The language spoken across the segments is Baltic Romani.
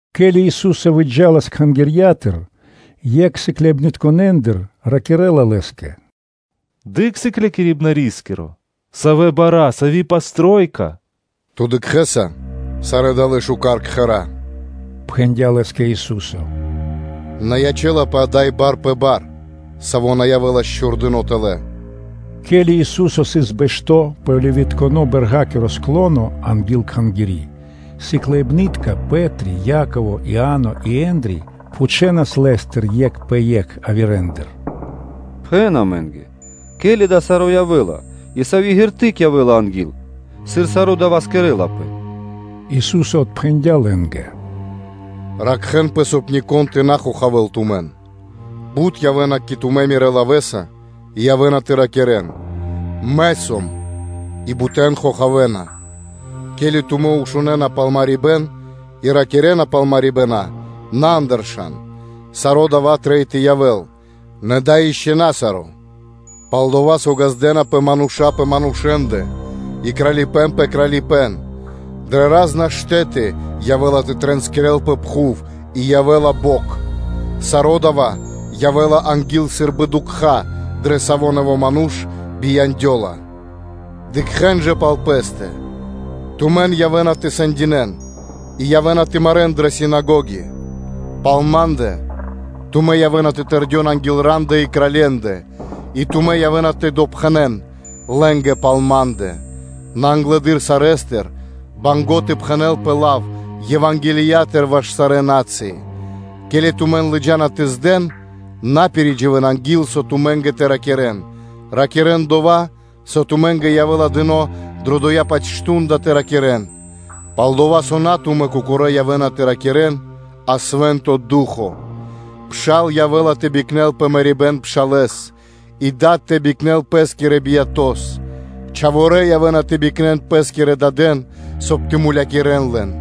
Ке́ли Ису́со выджа́лас Кхангирья́тыр, екх сыкляибнытконэндыр ракирэ́ла Лэ́скэ: “Дыкх, Сыклякирибнарискиро! Савэ бара́! Савэ упрэкэрибэна!” “Ту дыкхэ́са сарэ́ далэ́ барэ́ кхэра́?”, – пхэндя́ Лэ́скэ Ису́со. “На ячэ́лапэ ада́й бар пэ бар, саво́ на явэ́лас чхурдыно́ тэлэ́.” Ке́ли Ису́со сыс бэшто́ пэ Оливитконэ-бэрга́киро склоно анги́л Кхангири́, сыкляибны́тка Пэ́три, Яково, Иа́но и Ендри пхучэнас Лэ́стыр екх пэ екх явирэндыр: “Пхэн амэ́нгэ, ке́ли дава́ саро́ явэ́ла и сави́ шпэ́ра (знако) явэ́ла анги́л, сыр саро́ дава́ кэрэ́лапэ?” Ису́со отпхэндя́ Лэ́нгэ: “Ракхэ́нпэ, соб (кай) нико́н тэ на хохавэ́л тумэн. Бут явэ́на кэ тумэ́ Мирэ́ лавэ́са и явэ́на тэ ракирэ́н: ‘Мэ сом’, и бутэн хохавэна. Ке́ли тумэ́ шунэна пал марибэ́н и мавлыня (малвы) пал марибэна, на андыршан. Саро́ дава́ трэй тэ явэ́л, нэ дава́ ишчо (инкэ́) на саро́. Пал-дова́ со ґаздэ́напэ мануша́ пэ манушэ́ндэ и кралипэ́н пэ кралипэ́н. Дрэ ра́зна штэ́ты явэ́ла тэ тринскирэлпэ пхув и явэ́ла бокх. Саро́ дава́ явэ́ла анги́л сы́рбы дукха́, дрэ савэ́ нэво́ ману́ш бияндёла, Дыкхэ́н жа пал пэ́стэ; тумэн явэ́на тэ сэндинэ́н, и явэ́на тэ марэ́н дрэ синагоги. Пал Ма́ндэ тумэн явэ́на тэ тырдэн анги́л рандэ и кралье́ндэ, и тумэ́ явэ́на тэ допхэнэн лэ́нгэ пал Ма́ндэ. Нэ англэды́р сарэ́стыр трэй тэ пхэнэлпэ лав Евангелиятыр ваш сарэ́ на́цыи. Ке́ли тумэн лыджа́на тэ здэн, на пиридживэн анги́л, со тумэ́нгэ тэ ракирэ́н; ракирэ́н дова́, со тумэ́нгэ явэ́ла дыно́ дрэ дова́-паць мардо́ (шту́нда) тэ ракирэ́н; пал-дова́ со на тумэ́ кокорэ́ явэ́на тэ ракирэ́н, а Свэ́нто Ду́хо (Фа́но). Пшал явэ́ла тэ бикнэл пэ мэрибэ́н пшалэ́с и дад явэ́ла тэ бикнэл пэ́скирэс биято́с; чхаворэ́ явэ́на тэ бикнэн пэ́скирэ дадэн, соб (кай) тэ мулякирэ́н лэн.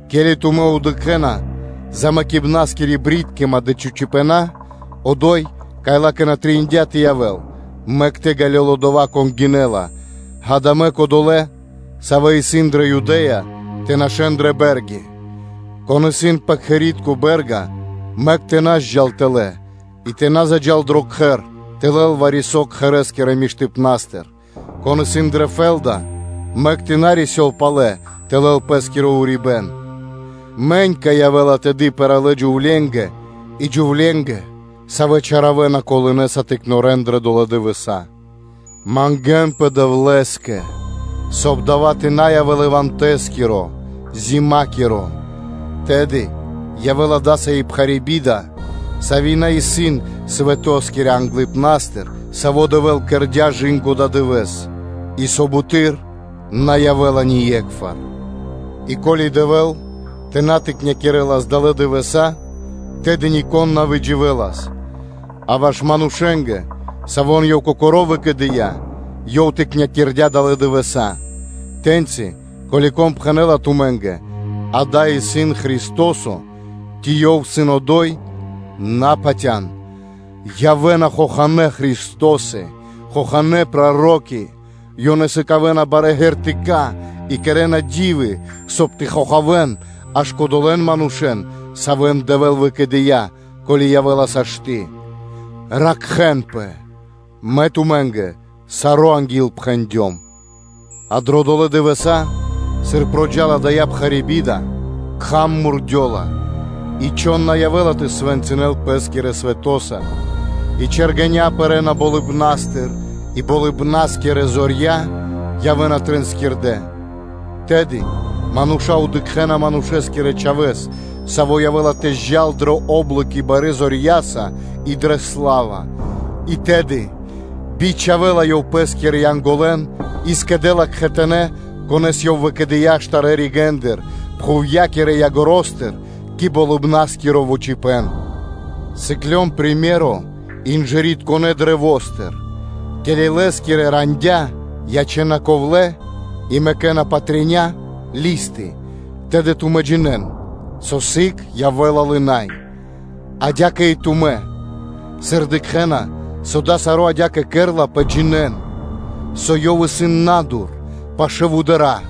Ке́ли тумэ́ дыкхэ́на голотынякиро/ замэкибнаскиро джунгалыпэ́н (брыткима), одо́й, кай ла́кэ на трэиндя́ тэ явэ́л (мэк тэ ґалёл одова́, кон гинэ́ла), ґа́да, мэк одолэ́, савэ́ исын дрэ Юдэ́я, тэ нашэ́н дрэ бэ́рги; кон исын пэ кхэри́тко бэ́рга, мэк тэ на зджал тэлэ́, и тэ на джал тэлэ дро кхэр тэ лэл вари-со кхэрэ́скирэ миштыпна́стыр. Кон исын дрэ фэ́лда, мэк тэ на рисёл палэ тэ лэл пэ́скиро урибэ́н. Мэнька явэ́ла тэды пэралэ джувленгэ и джувленгэ, савэ́ чаравэна колынэса тыкнорэн дрэ долэ́ дывэса́! Мангэ́нпэ Дэвлэ́скэ, соб (кай) дава́ тэ на явэ́л ивантакиро/ивэндэскиро (зимакиро). Тэды явэ́ла дасави́ пхари́ би́да, сави́ на сыс свэто́скирэ англыпна́стыр, саво́ Дэвэ́л кэрдя́, кэ ададывэ́с, и со буты́р на явэ́ла ние́кхвар. И ко́ли Дэвэ́л тэ на тыкнякирэлас далэ́ дывэса́, тэды нико́н на выдживэлас. А ваш манушэ́нгэ, савэ́н Ёв Кокоро́ выкэдыя́, Ёв тыкнякирдя далэ́ дывэса́. Тэ́ньци ко́ли вари-кон пхэнэ́ла тумэ́нгэ: ‘Ѓа́да, исын Христо́со!’ Ци ‘Ёв исын одо́й’, – на патя́н, явэ́на хоханэ́ Христосы, хоханэ́ проро́ки; ёнэ сыкавэ́на барэ́ ґэртыка (знаме́нии) и кэрэ́на ди́вы, соб (кай) тэ хохавэн аж кодолэ́н манушэ́н, савэ́н Дэвэ́л выкэдыя́, ко́ли явэ́ла сашты́. Ракхэ́нпэ. Мэ тумэ́нгэ саро́ анги́л пхэндём. А дро долэ́ дывэса́, сыр проджа́ла (накхэла) дая́ пхари́ би́да, кхам мурдёла, и чхон на явэ́ла тэ свэнцынэл пэ́скирэ свэтоса (лосаса), и чэргэня́ пэрэ́на болыбна́стыр, и болыбна́скирэ зорья явэ́на тринскирдэ. Тэды мануша́ дыкхэ́на Манушэ́скирэ Чхавэ́с, Саво́ явэ́ла тэ джал дрэ о́блоки барэ́ зорья́са и дрэ сла́ва. И тэды бичхавэ́ла Ёв Пэ́скирэ Янголэн и скэдэ́ла кхэтанэ́, конэ́с Ёв выкэдыя́ штарэ́ ригэ́ндыр, пхувья́кирэ ягоро́стыр (краёстыр) кэ Болыбна́скиро яго́ро. Сыклён приме́ро (сыкаибэ́н) инжыритконэ каштэ́стыр: ке́ли лэ́скирэ рандя́ ячэ́на ковлэ́ и мэкэ́на патря (листы), то тумэ́ джинэ́н, со сыг явэ́ла лынай (нилай) адя́кэ и тумэ́, сыр дыкхэ́на, со дава́ саро́ адя́кэ кэрлапэ, джинэ́н, со Ёв исын на́дур, пашы́л вудара́.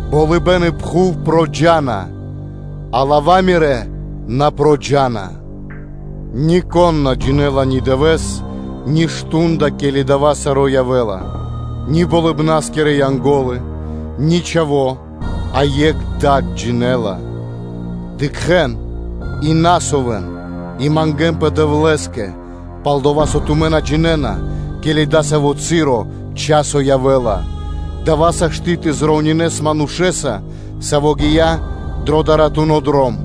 Болыбэ́н и пхув проджа́на, а лава́ Мирэ́ на проджа́на. Нико́н на джинэ́ла ни дывэ́с, ни мардо́ (шту́нда), ке́ли дава́ саро́ явэ́ла, ни болыбна́скирэ Янго́лы, ни Чхаво́ – а екх Дад джинэ́ла. Дыкхэ́н, и ракхэ́нпэ и мангэ́нпэ Дэвлэ́скэ: пал-дова́ со тумэ́ на джинэ́на, ке́ли дасаво часо явэ́ла. Дава́ сашты́ (можна) тэ примеринэс манушэ́са, саво́ гия́ дро даратуно дром.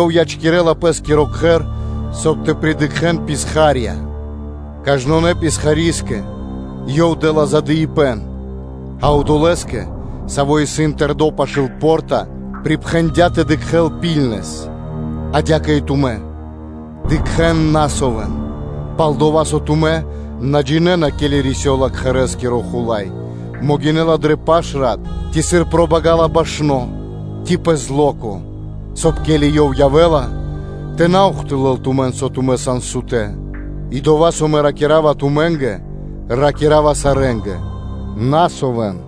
Ёв ячкирэ́ла пэ́скиро кхэр, соб (кай) тэ придыкхэн писха́рья. Кажнонэ́скэ писхари́скэ ёв дэ́ла задыибэн, а одолэ́скэ, саво́ сыс тэрдо́ пашы́л по́рта, припхэндя́ тэ дыкхэ́л ракхунэс (пильнэс). Адя́кэ и тумэ́: “Дыкхэ́н, на совэн!” Пал-дова́ со тумэ́ на джинэ́на, ке́ли рисёла кхэрэ́скиро хула́й: могинэ́ла дрэ паш рат, ци сыр пробагала башно, ци пэ зло́ко; соб (кай), ке́ли ёв явэ́ла, тэ на заухтылэл тумэн, со тумэ́ сан сутэ́. И дова́, со Мэ ракира́ва тумэ́нгэ, ракира́ва сарэ́нгэ: ракхэ́нпэ!”